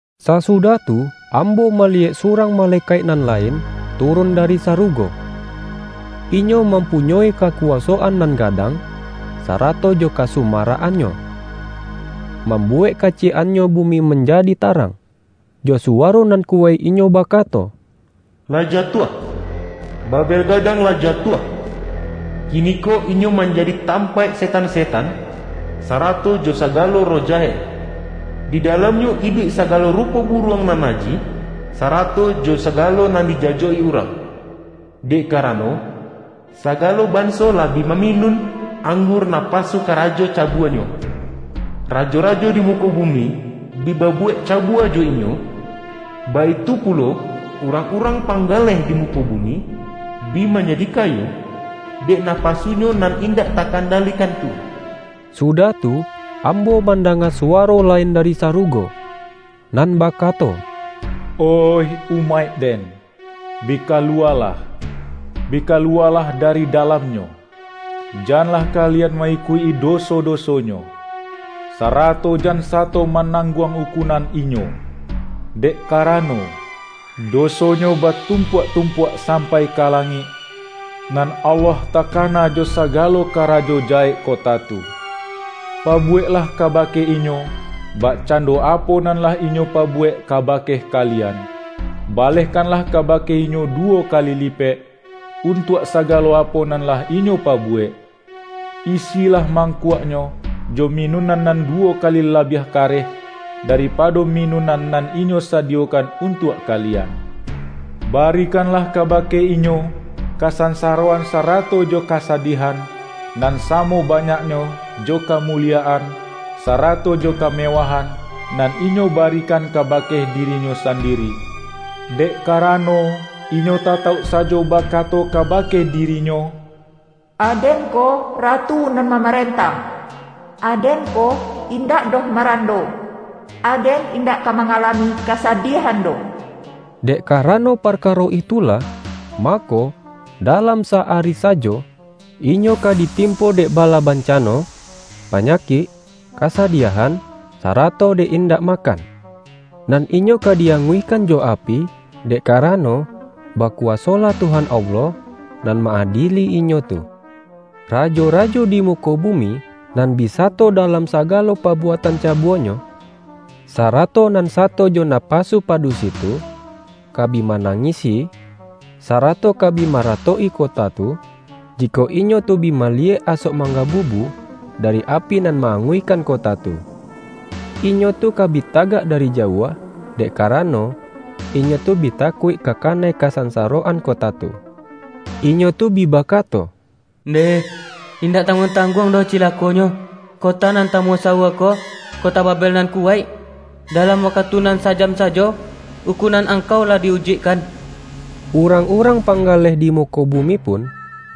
Sasudah tu, ambo maliyek su-rang malekaik nan lain, turun dari sarugo. Inyo mampunyoi kaku-wasoan nan gadang, sarato jo kasu-marak-annyo, mambuwek kaciyek-an-nyo bumi manjadi tarang. Jo suwaro nan kuwaik, inyo bakato,”Lah jatuah! Babel gadang lah jatuah! Kiniko inyo manjadi tampaik setan-setan, sarato jo sagalo roh jahek. Di dalamnyo iduik sagalo rupo buruang nan najih, sara-to jo sagalo nan dijajok-i urang. Dek karano, sagalo banso lah bi maminun anggur napasu karajo cabuanyo. Rajo-rajo di muko bumi, bi babuwek cabua jo inyo, baitu pulo, urang-urang pang-galeh di muko bumi, bi manjadi kayo, dek napasunyo nan indak takandali-kan tu.” Sudah tu, ambo mandanga suwaro lain dari sarugo, nan bakato,”Oih umaik-Den, bi kaluwalah! Bi kaluwalah dari dalamnyo! Janlah kalian ma-ikuik-i doso-dosonyo, sarato jan sato manangguang ukunan inyo! Dek karano, dosonyo batum-puak-tumpuak sampai ka langik, nan Allah takana jo sagalo karajo jahek kota tu. Pabuweklah kabake inyo, bakcando apo nan lah inyo pabuwek kabake kalian; balehkanlah kabake inyo duwo kali lipek, untuak sagalo apo nan lah inyo pabuwek. Isilah mangkuaknyo, jo minunan nan duwo kali labiah kareh, daripado minunan nan inyo sadiyokan untuak kalian. Barikanlah kabake inyo, kasansaroan sarato jo kasadiahan, nan samo banyaknyo jo kamuliyaan, sarato jo kamewahan, nan inyo barikan kabake dirinyo sandiri. Dek karano, inyo tatauk sajo bakato kabake dirinyo, ’Aden ko ratu nan mamarentah! Aden ko, indak doh marando; aden indak ka mangalami kasadiahan doh!’ Dek karano parkaro itulah, mako, dalam sa-ari sajo, inyo ka ditimpo dek bala bancano -- panyakik, kasadiahan, sarato dek indak makan. Nan inyo ka di-anguihkan jo api, dek karano, bakuwasolah Tuhan Allah, nan ma-adieli inyo tu.” Rajo-rajo di muko bumi, nan bi sa-to dalam sagalo pabuatan cabuanyo, sarato nan sato jo napasu padusi tu, ka bi manangisi, sarato ka bi mara-tok-i kota tu, jikok inyo tu bi maliyek asok manggabubu, dari api nan ma-anguihkan kota tu. Inyo tu ka bi ta-gak dari jauah, dek karano, inyo tu bi takuik ka kanai kasansaroan kota tu. Inyo tu bi bakato,”Ndeh, indak tang-guang-tangguang doh cilakonyo, kota nan tamusawua ko kota Babel nan kuwaik! Dalam wakatu nan sa-jam sa-jo, ukunan angkau lah di-ujuikkan!” Urang-urang panggaleh di muko bumi pun,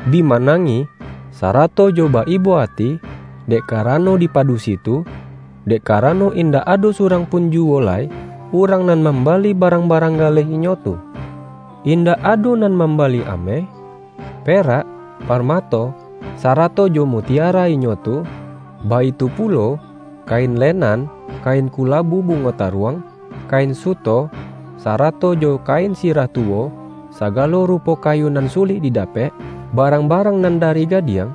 bi manangih, sarato jo ba-ibo ati, dek karano di padusi tu, dek karano, indak ado surang pun juwo lai, urang nan mambali barang-ba-rang galeh inyo tu. Indak ado nan mambali ameh, perak, parmato, sara-to jo mutiara inyo tu; baitu pulo, ka-in lenan, kain kulabu bungo taruang, kain suto, sarato jo kain sirah tuwo; sagalo rupo kayu nan sulik didapek, barang-barang nan dari gadiang,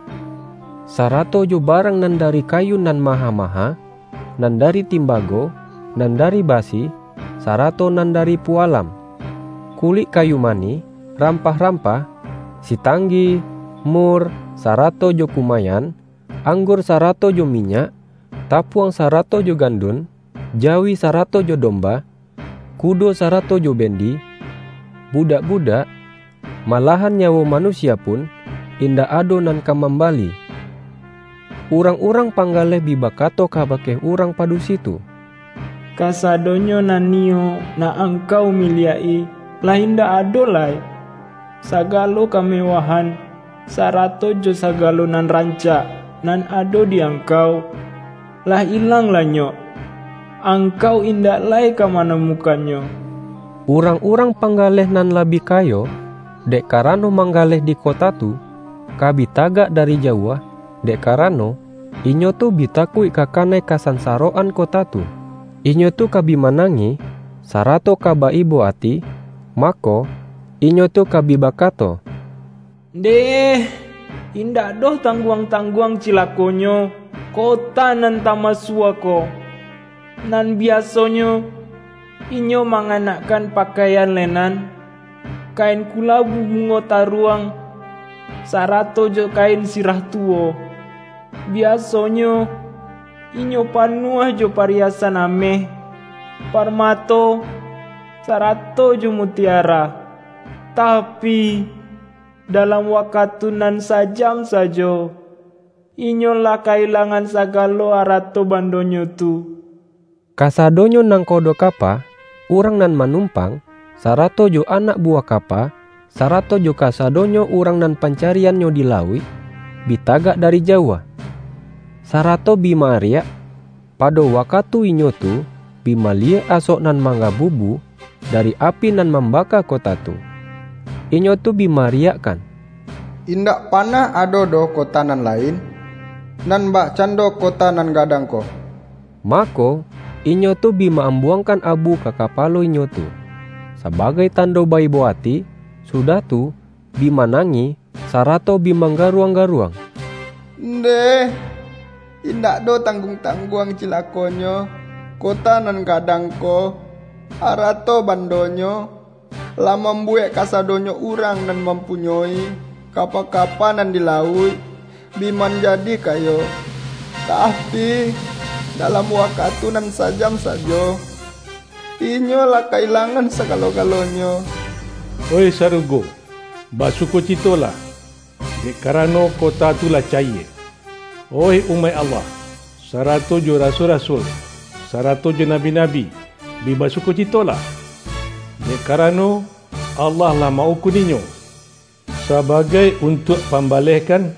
sa-rato jo barang nan dari kayu nan maha-maha, nan dari timbago, nan dari basi, sarato nan dari pualam; ku-lik kayu manih, rampah-rampah, si-tanggi, mur, sarato jo kumayan; ang-gur sarato jo minyak, tapuang sarato jo gandun; jawi sarato jo domba, ku-do sarato jo bendi, budak-budak, ma-lahan nyawo manusia pun, indak ado nan ka mambali. Urang-urang panggaleh bi bakato kabake urang padusi tu,”Kasadonyo nan niyo nak angkau miliak-i, lah indak ado lai, sa-galo kamewahan, sarato jo sagalo nan rancak nan ado di angkau, lah ilang-lanyok. Angkau indak lai ka manamu-kannyo!” Urang-urang panggaleh nan lah bi kayo, dek karano mangga-leh di kota tu, ka bi tagak dari jauah, dek karano, inyo tu bi takuik ka ka-nai kasansaroan kota tu. Inyo tu ka bi manangih, sarato ka ba-ibo ati, ma-ko, inyo tu ka bi bakato,”Ndeh, indak doh tangguang-tangguang cilakonyo kota nan tamusawua ko! Nan biaso-nyo, inyo manganakkan pakaian le-nan, kain kulabu bungo taruang, sara-to jo kain sirah tuwo; biasonyo, inyo panuah jo pariyasan ameh, parma-to, sarato jo mutiara! Tapi, dalam wakatu nan sa-jam sajo, inyo lah ka-ilangan sagalo arato-bandonyo tu!” Kasadonyo nangkodo kapa, urang nan manumpang, sarato jo anak bu-wah kapa, sarato jo kasadonyo urang nan pancariannyo di lauik, bi tagak dari jauah. Sarato bi ma-ariak, pa-do wakatu inyo tu bi maliyek asok nan manggabubu, dari api nan mam-baka kota tu. Inyo tu bi ma-ariakkan,”Indak panah ado doh kota nan lain, nan bakcando kota nan gadang ko!” Mako, inyo tu bi ma-ambuangkan abu ka kapalo inyo tu, sabagai tando ba-ibo ati, sudah tu, bi manangih, sa-rato bi manggaruang-garuang,”Ndeh, indak doh tangguang-tangguang cilakonyo kota nan gadang ko! Arato-bandonyo, lah mambuwek kasadonyo urang nan mampunyoi kapa-kapa nan di lauik, bi manjadi kayo! Tapi, dalam wakatu nan sa-jam sajo, inyo lah ka-ilangan sagalo-galonyo!” Oih sarugo, basukocitolah, dek karano kota tu lah cayie! Oih umaik Allah, sarato jo rasul-rasul, sarato jo nabi-nabi, bi basukocitolah! Dek ka-rano, Allah lah ma-ukun inyo, saba-gai untuak pambalehkan,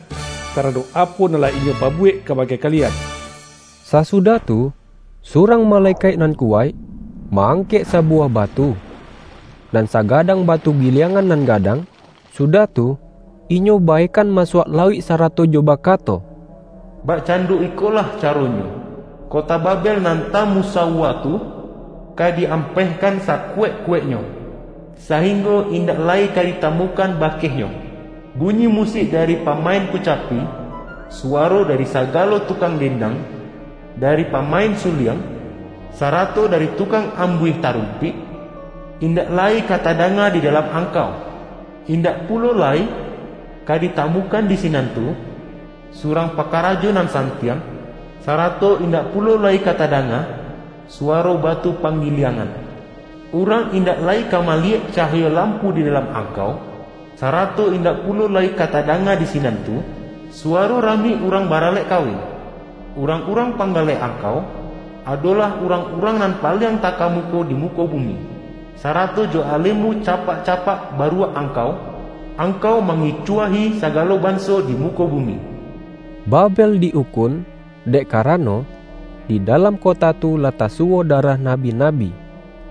taradok apo nan lah inyo pabuwek kabake kali-an! Sasudah tu, surang malekaik nan kuwaik, ma-angkek sabuwah batu — nan sagadang batu giliangan nan ga-dang — sudah tu, inyo baekan masuak lauik sarato jo bakato,”Bakcando ikolah caronyo, kota Babel nan ta-musawua tu, ka di-ampehkan saku-waik-kuwaiknyo, sainggo indak lai ka ditamukan bakehnyo. Bunyi musik dari pamain kucapi, suwaro dari sa-galo tukang dendang, dari pamain su-liang, sarato dari tukang ambuih ta-rumpik, indak lai ka tadanga di dalam angkau! Indak pulo lai ka ditamukan di sinan tu, surang pakarajo nan san-tiang, sarato indak pulo lai ka tadanga suwaro batu panggiliangan. Urang indak lai ka maliyek cahayo lampu di dalam angkau; sarato indak pulo lai ka tadanga di sinan tu, suwaro rami urang baralek kawin. Urang-urang panggaleh angkau, adolah urang-urang nan paliang takamuko di muko bumi, sarato jo alemu capak-capak ba-ruak angkau, angkau mangicuahi sa-galo banso di muko bumi!” Babel di-ukun, dek karano, di dalam kota tu lah tasuwo darah na-bi-nabi,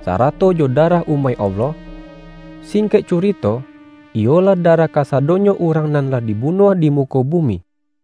sarato jo darah umaik Allah — singkek curito, iyolah darah kasado-nyo urang nan lah dibunuah di mu-ko bumi.